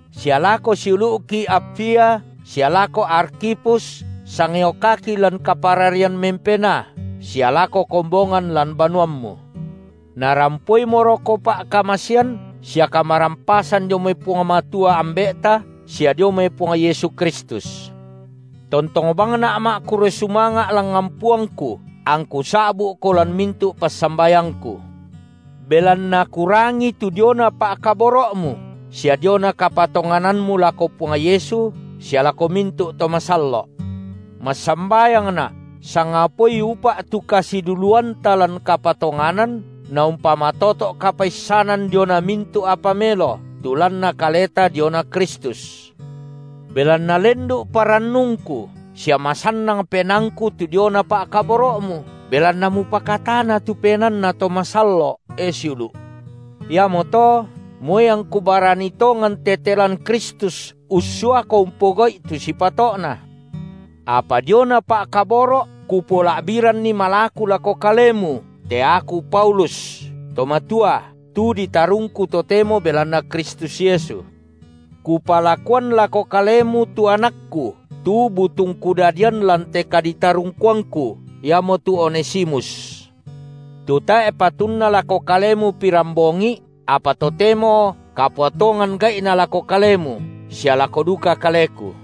sia lako siulu’ki Apfia, sia lako Arkhipus, sangayokaki lan kapararian mempenaa, sia lako kombongan lan banuammu. Narampoimoroko pa’kamasean sia kamarampasan dio mai Puang Matua, Ambe’ta, sia dio mai Puang Yesu Kristus. Pa’kurre sumanga’ Tontong bangna’ ma’kurre sumanga’ langngan Puangku, angku sa’bu’ko lan mintu’ passambayangku, belanna kurangi tu diona pa’kaboro’mu sia diona kapatonganammu lako Puang Yesu sia lako mintu’ to masallo’. Massambayangna’ sangapaoi upa’ tu kasiduluanta lan kapatonganan naumpamatoto’ kapaissanan diona mintu’ apa melo, tu lanna kaleta diona Kristus. Belanna lendu’ parannungku sia masannang penaangku tu diona pa’kaboro’mu, belanna mupakatana tu penaanna to masallo’, e siulu’. Iamoto, moi angku barani tongan tete lan Kristus ussuako umpogau’i tu sipato’na, apa diona pa’kaboro’ kupola’biranni malaku lako kalemu, te aku Paulus, to matua, tu ditarungku totemo belanna Kristus Yesu, kupalakuan lako kalemu tu anakku, tu butung kudadian lan te kaditarungkuangku, iamotu Onesimus, tu tae’ patunna lako kalemu pirambongi’, apa totemo kapua tongan gai’na lako kalemu sia lako duka kaleku.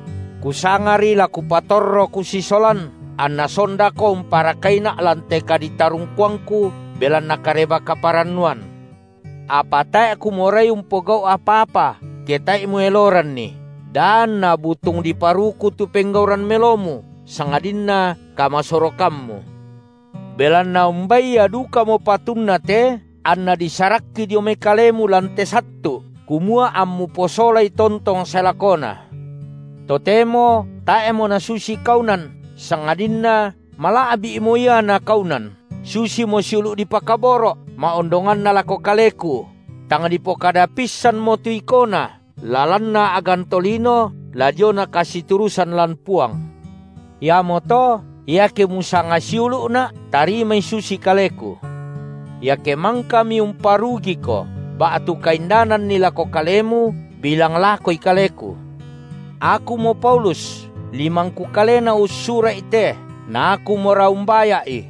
Kusangari la kupatorro kusisolan, anna sondako umparakaina’ lan te kaditarungkuangku belanna Kareba-kaparannuan. Apa tae’ kumorai umpogau’ apa-apa, ke tae’i mueloranni, da anna butung diparuku tu penggauran melomu, sangadinna kamasorokammu. Belanna umbai ia dukamo patunna te anna disarakki dio mai kalemu lan te sattu’, kumua ammu posolai tontong sae lakona, totemo tae’mo nasusi kaunan, sangadinna mala’bi’mo ia na kaunan, susimo siulu’ dipakaboro’, ma’ondonganna lako kaleku, tang dipokada pissanmo tu ikona, la lanna a’gan tolino, la diona kasiturusan lan Puang. Iamoto, iake musanga siulu’na’, tarimai susi kaleku. Iake mangkami umparugiko ba’tu kaindananni lako kalemu, bilang lakoi kaleku. Akumo Paulus, limangku kalena ussura’i te, na akumora umbaya’i;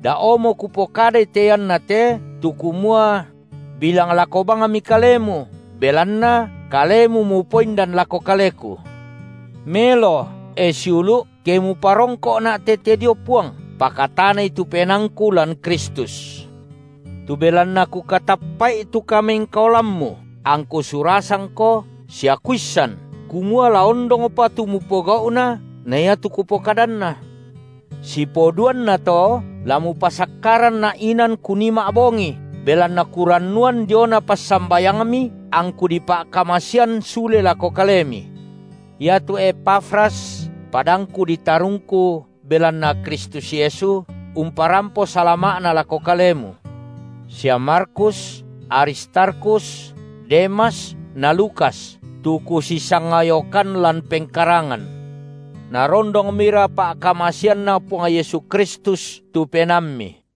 da’omo kupokadai te iannate tu kumua: bilang lako bangmi kalemu, belanna kalemu mupoindan lako kaleku. Melo, e siulu’, ke muparongko’na’ tete dio Puang; pakatanai tu penaangku lan Kristus. Tu belanna kukatappa’i tu kamengkaolammu, angku surasangko, sia kuissan kumua la ondongpa tu mupogau’na na iatu kupokadanna. Sipoduanna to, la mupasakkaranna’ inan kunii ma’bongi, belanna kurannuan diona passambayangmi angku dipa’kamasean sule lako kalemi. Iatu Epafras, padangku ditarungku belanna Kristus Yesu, umparampo salama’na lako kalemu, sia Markus, Aristarkhus, Demas na Lukas, tu kusisangayokan lan pengkarangan. Narondongmira pa’kamaseanNa Puang Yesu Kristus tu penaammi.